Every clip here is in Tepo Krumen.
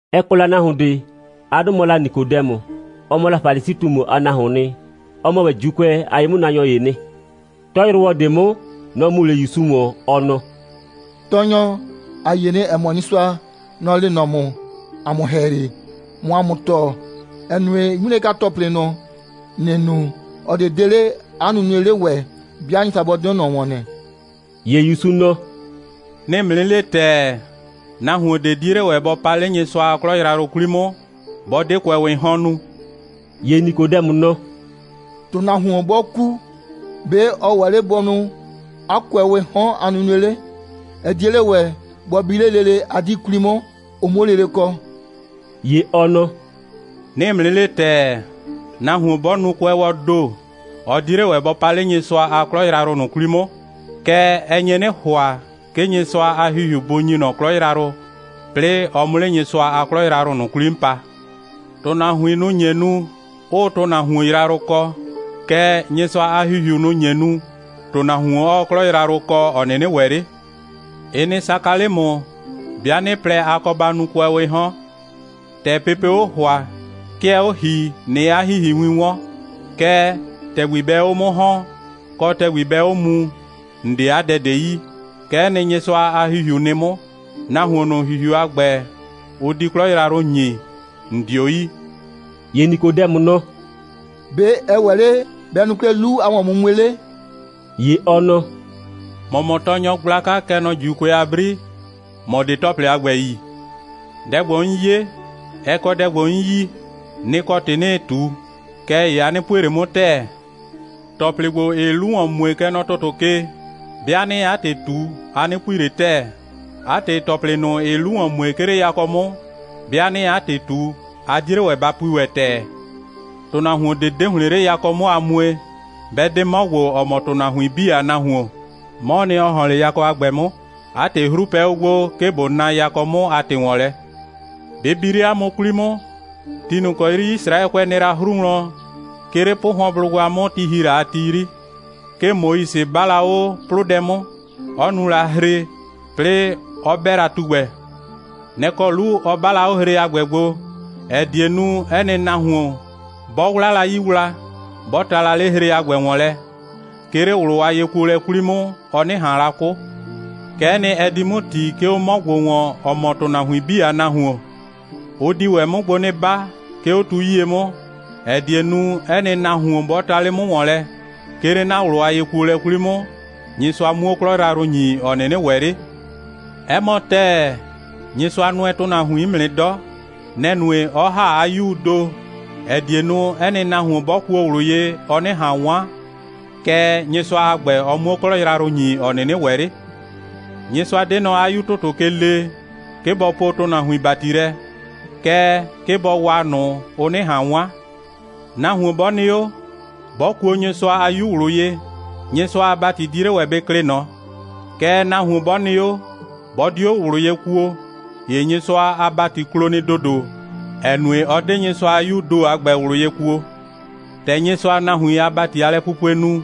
Ɛ kɔ la nahuon ꞊de. 'A 'dʋ mɔ la Nikodɛmʋ. Ɔ mɔ la Falisi꞊tumu a nahuoon nɩ. Ɔ mɔ ‑wɛ ‑Juukʋɛ a ye'mʋnaanyɔ ‑yee nɩ. 'Tɔyrʋwɔ ꞊de 'mʋ, nɔ‑ mu 'le ‑Yusu ‑wɔn, ɔ nɔ: «Tɔɔnyɔ, ‑a yie nɩ, ‑ɛ mɔ, Nyɩsʋa, nɔ‑ lee nɔ ‑mʋ ‑a mʋ ‑hɛyri, ꞊mʋ ‑a mʋ tɔɔ, ‑ɛ nue, 'ŋmilɛka‑tɔplɩ ꞊nʋ, ‑nɩɩ nu, ꞊ɔ ꞊de 'de 'le 'a nunue 'le ‑wɛ, 'bɩa Nyɩsʋa 'bɔ 'de 'o ꞊nɔ ‑wɔn nɩ.» ‑Ye ‑Yusu nɔ: «'Nɩɩ ‑mʋ 'nɩ le ‑tɛɛ, nahuon ꞊de 'die 'le ‑wɛ bɔ pa 'le Nyɩsʋa a 'klɔ yrayrʋ ꞊nʋ 'kwli 'mʋ, 'bɔ 'de kʋɛwɩɩ 'hɔn nu.» ‑Ye Nikodɛmʋ nɔ: «‑Tʋnahuon 'bɔ ku, ‑be' ɔ ‑wɛ 'le bɔ nu 'a kʋɛwɩɩ 'hɔn a nunue 'le? Ɛ 'die 'le ‑wɛ bɔ bi 'le lele 'a 'dii 'kwli 'mʋ, ʋ 'muo lele kɔ.» ‑Ye ɔ nɔ: «'Nɩɩ ‑mʋ 'nɩ le ‑tɛɛ, nahuon 'bɔ nu kʋɛwɔɔ ‑do, ɔ 'die 'le ‑wɛ bɔ pa 'le Nyɩsʋa a 'klɔ yrayrʋ ꞊nʋ 'kwli 'mʋ. Kɛɛ, ɛ nye 'nɩ ‑hʋa, 'ke Nyɩsʋa a ‑Hihiu bʋ ‑nyi ꞊nɔ 'klɔ yrayrʋ, 'plɩɩ ɔ 'mʋ 'le Nyɩsʋa a 'klɔ yrayrʋ ꞊nʋ 'kwli 'mʋ pa. ‑Tʋnahuin, nʋ‑ nye nu, 'ʋʋ ‑tʋnahuon yrayrʋ kɔ, kɛɛ, Nyɩsʋa a ‑Hihiu, nʋ‑ nye nu, ‑tʋnahuon 'ɔɔ 'klɔ yrayrʋ kɔ, ‑ɔ 'nɩnɩ ‑wɛ 'le. Ɩ nɩ saka 'le ‑mʋ, 'bɩa 'nɩ po lɛ, a kɔ ba nu kʋɛwɩɩ 'hɔn. ‑Tɛ pepee 'o ‑hʋa, 'ke ɛɛ 'o ‑hii, ꞊nɩɩ 'a ‑hihiwin 'wɔn, kɛɛ, ‑tɛgbi bɛɛ 'o 'mʋ ‑hɔn, kɔ, ‑tɛgbi bɛɛ 'o muu, ‑n 'de 'a dɛ ꞊de yi. Kɛ'ɛ nɩ, Nyɩsʋa a ‑Hihiu nɩ 'mʋ. Nahuon ꞊nʋ, ‑Hihiu a ‑gbɛ, ʋ di 'klɔ yrayrʋ ‑nyi, ‑n 'dio yi.» ‑Ye Nikodɛmʋ nɔ: «‑Be' ɛ ‑wɛ 'le bɛ nu 'klɛɛ 'lu a ‑wɔnmumue 'le?» ‑Ye ɔ nɔ: «‑Mɔ mɔ tɔɔnyɔ gblaka, kɛ nɔ ‑Juukʋɛ a 'bri, ‑mɔ 'de ‑tɔplɩ a ‑gbɛ yi. Dɛ ‑gbo, 'n 'ye, ɛ kɔ dɛ ‑gbo, 'n yi, nɩ‑ kɔ ‑tɩ 'nɩɩ ꞊tu. Kɛɛ ‑ye a 'nɩ pue ꞊le 'mʋ ‑tɛɛ. ‑Tɔplɩ ‑gbo, ‑ɩɩ 'lu ‑wɔn mue, kɛ nɔ ‑tʋtʋ ke, 'bɩa 'nɩɩ 'a ‑tɩ ꞊tu, a 'nɩ pui ꞊le ‑tɛɛ. 'A ‑tɩ, ‑tɔplɩ ꞊nʋ, ‑ɩɩ 'lu ‑wɔn mue, 'ke 'le yakɔ 'mʋ, 'bɩa 'nɩɩ 'a ‑tɩ ꞊tu, a 'die 'le ‑wɛ ba pui ‑wɛ ‑tɛɛ. ‑Tʋnahuon ꞊de 'de ‑hlɩn 'le yakɔ 'mʋ a mue, 'bɛ 'de 'mɔ ‑gbo, ‑ɔ mɔ ‑tʋnahuin 'bii a Nahuon. 'Mɔɔ nɩ, ‑ɔ ‑hɔn 'le yakɔ a ‑gbɛ 'mʋ. 'A ‑tɩ, 'hru pɛ 'o gbo, 'ke ꞊bo na yakɔ 'mʋ a ‑tɩ ‑wɔn lɛ. Bɩ bi 'le ‑mʋ 'kwli 'mʋ, ti ꞊nʋ ‑kɔ 'yri Yisraɛkʋɛ nɩ la 'hru wlɔn, 'ke 'le 'pʋhʋɔnblʋgba 'mʋ, ti ‑hi la a ti 'yri, 'ke Moise 'ba la 'o 'plʋdɛ 'mʋ, 'ɔ nu la hre, 'plɩɩ 'ɔ 'bɛ la tugbɛ. Nɛ‑ kɔ 'lu ɔ 'ba la 'o hre a ‑gbɛ gbo, ‑ɛ die nu, 'ɛ nɩ nahuon, 'bɔ 'wla la 'yii wla, 'bɔ ta la 'le hre a ‑gbɛ ‑wɔn lɛ, 'ke 'le ꞊wlʋ a yekuolɛ 'kwli 'mʋ, ɔ 'nɩ ꞊han la 'kʋ. Kɛ'ɛ nɩ, ɛ di 'mʋ ‑ti, 'ke 'o 'mɔ ‑gbo ‑wɔn, ‑ɔ mɔ ‑tʋnahuin 'bii a Nahuon. Ʋ di ‑wɛ 'mʋ gbo 'nɩ 'ba, 'ke 'o tu 'yie 'mʋ, ‑ɛ die nu, 'ɛ nɩ nahuon, 'bɔ ta 'le 'mʋ ‑wɔn lɛ, 'ke 'le 'na ꞊wlʋ a yekuolɛ 'kwli 'mʋ, Nyɩsʋa 'muo 'klɔ yrayrʋ ‑nyi, ‑ɔ 'nɩnɩ ‑wɛ 'le. 'Ɛ mɔ ‑tɛɛ, Nyɩsʋa nʋɛ ‑tʋnahuin 'mʋ nɩ 'dɔ. Nɛ‑ nue, 'ɔ ‑ha 'a 'Yuu ‑do, ‑ɛ die nu, 'ɛ nɩ nahuon, 'bɔ kuo ꞊wlʋ ye, ɔ 'nɩ ꞊han 'wan, kɛɛ, Nyɩsʋa a ‑gbɛ, ɔ 'muo 'klɔ yrayrʋ ‑nyi, ‑ɔ 'nɩnɩ ‑wɛ 'le. Nyɩsʋa 'de nɔ 'a 'Yu ‑tʋtʋ ke lee, 'ke bɔ poo ‑tʋnahuin ‑bati lɛ, kɛɛ, 'ke bɔ waa ꞊nʋ, ʋ 'nɩ ꞊han 'wan. Nahuon 'bɔ nɩ 'o, 'bɔ kuo Nyɩsʋa a 'Yu ꞊wlʋ ye, Nyɩsʋa a ‑bati 'die 'le ‑wɛ bɩ klɩ ꞊nɔ. Kɛɛ, nahuon 'bɔ nɩ 'o, 'bɔ 'dio ꞊wlʋ ye kuo, ‑ye Nyɩsʋa a ‑bati klo nɩ ‑dodo, ‑ɛ nue, ɔ 'de Nyɩsʋa a 'Yuu ‑do a ‑gbɛ ꞊wlʋ ye kuo. ‑Tɛ Nyɩsʋaa nahuin a ‑bati a lɛpupue nu,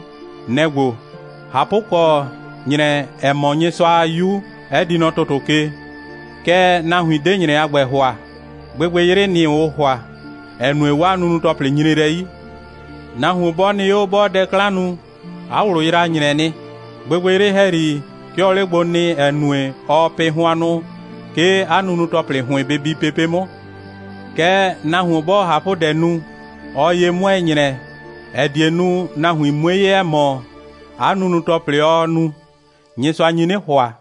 nɛ‑ ‑gbo: ꞊Hapʋkɔ, ‑nyrɛ, ‑ɛ mɔ Nyɩsʋa a 'Yu, 'ɛ di nɔ ‑tʋtʋ ke, kɛɛ, nahuin 'de ‑nyrɛ a ‑gbɛ ‑hʋa. Gbɩgbɩyrɩ, nɩ‑ ʋʋ ‑hʋa, ‑ɛ nue, 'waa nunu‑tɔplɩ nyre lɛ 'yi. Nahuon 'bɔ nɩ 'o, 'bɔɔ dɛ 'klan nu, 'a ꞊wlʋ yraa ‑nyrɛ nɩ. Gbɩgbɩyrɩ ‑hɛyri, 'ke ɔɔ 'le gbo nɩ, ‑ɛ nue, ɔɔ pɩ hʋannʋ, 'ke 'a nunu‑tɔplɩ ‑hʋɩn bɩ bi pepe' 'mʋ. Kɛɛ, nahuon 'bɔɔ ꞊hapʋdɛ nu, ɔɔ ye 'mʋɛɛ ‑nyrɛ, ‑ɛ die nu, nahuin 'mue 'ye, ‑ɛ mɔ, 'a nunu‑tɔplɩ, ɔɔ nu, Nyɩsʋa nyi 'nɩ ‑hʋa.»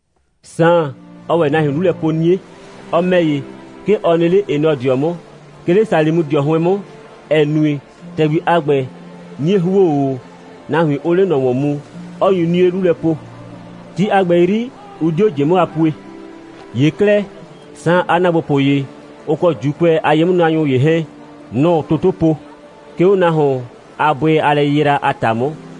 Saan, ɔɔ ‑wɛ nahuin 'lu lɛ po 'nie. Ɔ ‑mɛ ‑ye, 'ke ɔ nɩ 'le Enɔdɩɔ 'mʋ, 'ke 'le Salimʋdɩɔ 'hʋɩn 'mʋ, ‑ɛ nue, ‑tɛgbi a ‑gbɛ 'nie ‑huo 'o, nahuin 'ʋʋ 'le ꞊nɔ ‑wɔn mu, 'ɔ nyu 'nie 'lu lɛ po. Ti a ‑gbɛ 'yri, ʋ 'dio ꞊jɩ 'mʋ a pue. ‑Ye 'klɛɛ, Saan a ‑naagbopʋ ‑ye, ʋ kɔ ‑Juukʋɛ a ye'mʋnaanyɔ ‑ye 'hɛɛn, nʋ‑ʋ toto po, 'ke 'o nahuon a bʋɩ a lɛyɩyra a ‑ta 'mʋ,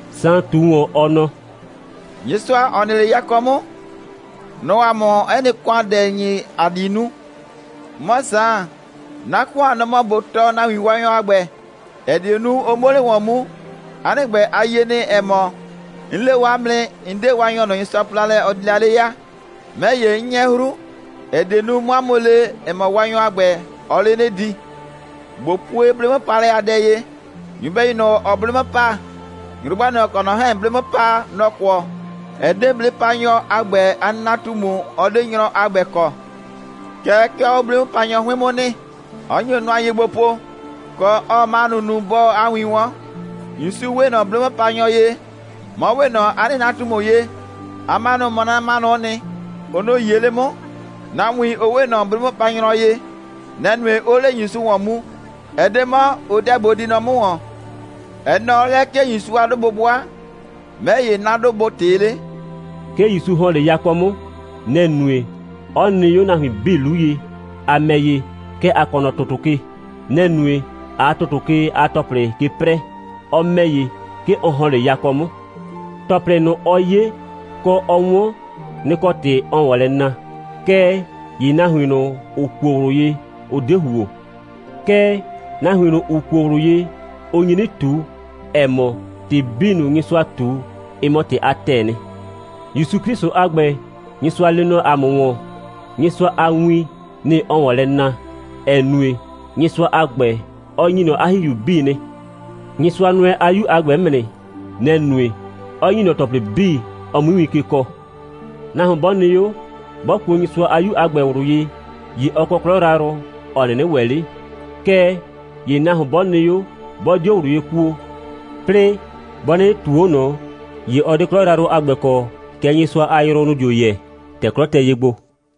Saan ꞊tu ‑wɔn, ɔ nɔ: «Nyɩsʋa, ‑ɔ nɩ 'le yakɔ 'mʋ, nɔ‑ɔ ‑a mʋ 'ɛ nɩ ‑kʋandɛ ‑nyi, ‑a di nu. 'Mɔ Saan, 'na ‑kʋan, nɔ‑ mɔ ꞊bo tɔɔ nahuin Waanyɔ a ‑gbɛ, ‑ɛ die nu, ʋ 'muo 'le ‑wɔn mu. 'A nɩ ‑gbɛ, a yie nɩ, ‑ɛ mɔ, 'n le o 'a mʋ nɩ, 'n 'de Waanyɔ ꞊nʋ, Nyɩsʋa po la lɛ, ɔ di la 'le ya. 'Mɛ ‑ye, 'n 'nyɛ 'hru, ‑ɛ die nu, 'mʋ 'a mʋ le, ‑ɛ mɔ, Waanyɔ a ‑gbɛ, ɔɔ 'le 'nɩ di. ꞊Bo pue 'blɩ'mʋpaalɛ a dɛ ye. Nyɩbɛyu ꞊nʋ, ‑ɔɔ 'blɩ 'mʋ pa, nyrʋgba ꞊nʋ, ‑ɔ kɔ ꞊nɔ 'hɛɛn 'blɩ 'mʋ pa, nɔ‑ kʋɔ. Ɛ 'de 'blɩ'mʋpanyɔ a ‑gbɛ a nɩnatumu, ɔ 'de nyrɔ a ‑gbɛ kɔ. Kɛɛ, 'ke ɔɔ 'o 'blɩ'mʋpanyɔ 'hʋɩn 'mʋ nɩ, 'ɔ nyo nʋa ye gbo po, kɔ, 'ɔɔ 'manʋ nu, 'bɔɔ 'a win 'wɔn. ‑Yusu 'we ꞊nɔ 'blɩ'mʋpanyɔ ye, 'mɔ 'we ꞊nɔ 'a nɩnatumu ye, 'a 'manʋ mɔ 'na 'manʋ'ʋ nɩ. Ʋ nʋ‑ 'yie 'le 'mʋ. Nahuin, ʋ 'we ꞊nɔ 'blɩ'mʋpanyrɔ ye. Nɛ‑ nue, 'ʋʋ 'le ‑Yusu ‑wɔn mu. Ɛ 'de 'mɔ, ʋ 'deɛ bʋ di nɔ 'mʋ ‑wɔn. Ɛ nɔɔ 'o lɛ, 'ke ‑Yusu a 'dʋ bʋ 'bʋa, 'mɛ ‑ye, 'na 'dʋ bʋ ꞊tɩɩ 'le.» 'Ke ‑Yusu ‑hɔn 'le yakɔ 'mʋ. Nɛ‑ nue, 'ɔ nɩ 'o nahuin 'bii 'lu ye. ‑A ‑mɛ ‑ye, kɛ ‑a kɔ nɔ ‑tʋtʋ ke. Nɛ‑ nue, ꞊aa ‑tʋtʋ ke a ‑tɔplɩ ke 'prɛɛ. Ɔ ‑mɛ ‑ye, 'ke ɔ ‑hɔn 'le yakɔ 'mʋ. ‑Tɔplɩ ꞊nʋ, ɔ 'ye, kɔ, ɔ 'wɔn, nɩ‑ kɔ ‑tɩ ɔɔ ‑wɔn lɛ na. Kɛɛ ‑ye nahuin ꞊nʋ, ‑ʋ kuo ꞊wlʋ ye, ʋ 'de ‑huo. Kɛɛ, nahuin ꞊nʋ, ‑ʋ kuo ꞊wlʋ ye, ʋ nyi 'nɩ ꞊tu, ‑ɛ mɔ, ‑tɩ 'bii ꞊nʋ, Nyɩsʋaa ꞊tu, ɩ mɔ ‑tɩ a ‑tɛɛ nɩ. ‑Yusu 'Klɩsʋ a ‑gbɛ, Nyɩsʋa lee nɔ ‑a mʋ ‑wɔn, Nyɩsʋa a win, nɩ‑ ɔɔ ‑wɔn lɛ na, ‑ɛ nue, Nyɩsʋa a ‑gbɛ, ɔ ‑nyi ꞊nɔ 'a ‑Hihiu 'bii nɩ. Nyɩsʋa nʋɛ 'a 'Yu a ‑gbɛ 'mʋ nɩ. Nɛ‑ nue, 'ɔ ‑nyi ꞊nɔ ‑tɔplɩ 'bii, ɔ 'mui win ke kɔɔ. Nahuon 'bɔ nɩ 'o, 'bɔ kuo Nyɩsʋa a 'Yu a ‑gbɛ ꞊wlʋ ye, ‑ye ɔ kɔ 'klɔ yrayrʋ, ‑ɔ 'nɩnɩ ‑wɛ 'le. Kɛɛ ‑ye nahuon 'bɔ nɩ 'o, 'bɔ 'dio ꞊wlʋ ye kuo, 'plɩɩ 'bɔ 'nɩnɩ ꞊tuu 'o ꞊nɔ, ‑ye ɔ 'de 'klɔ yrayrʋ a ‑gbɛ kɔ, kɛɛ, Nyɩsʋa a yrʋ, nʋ‑ dio yɛ, ‑tɛ 'klɔ tɛ ye gbo.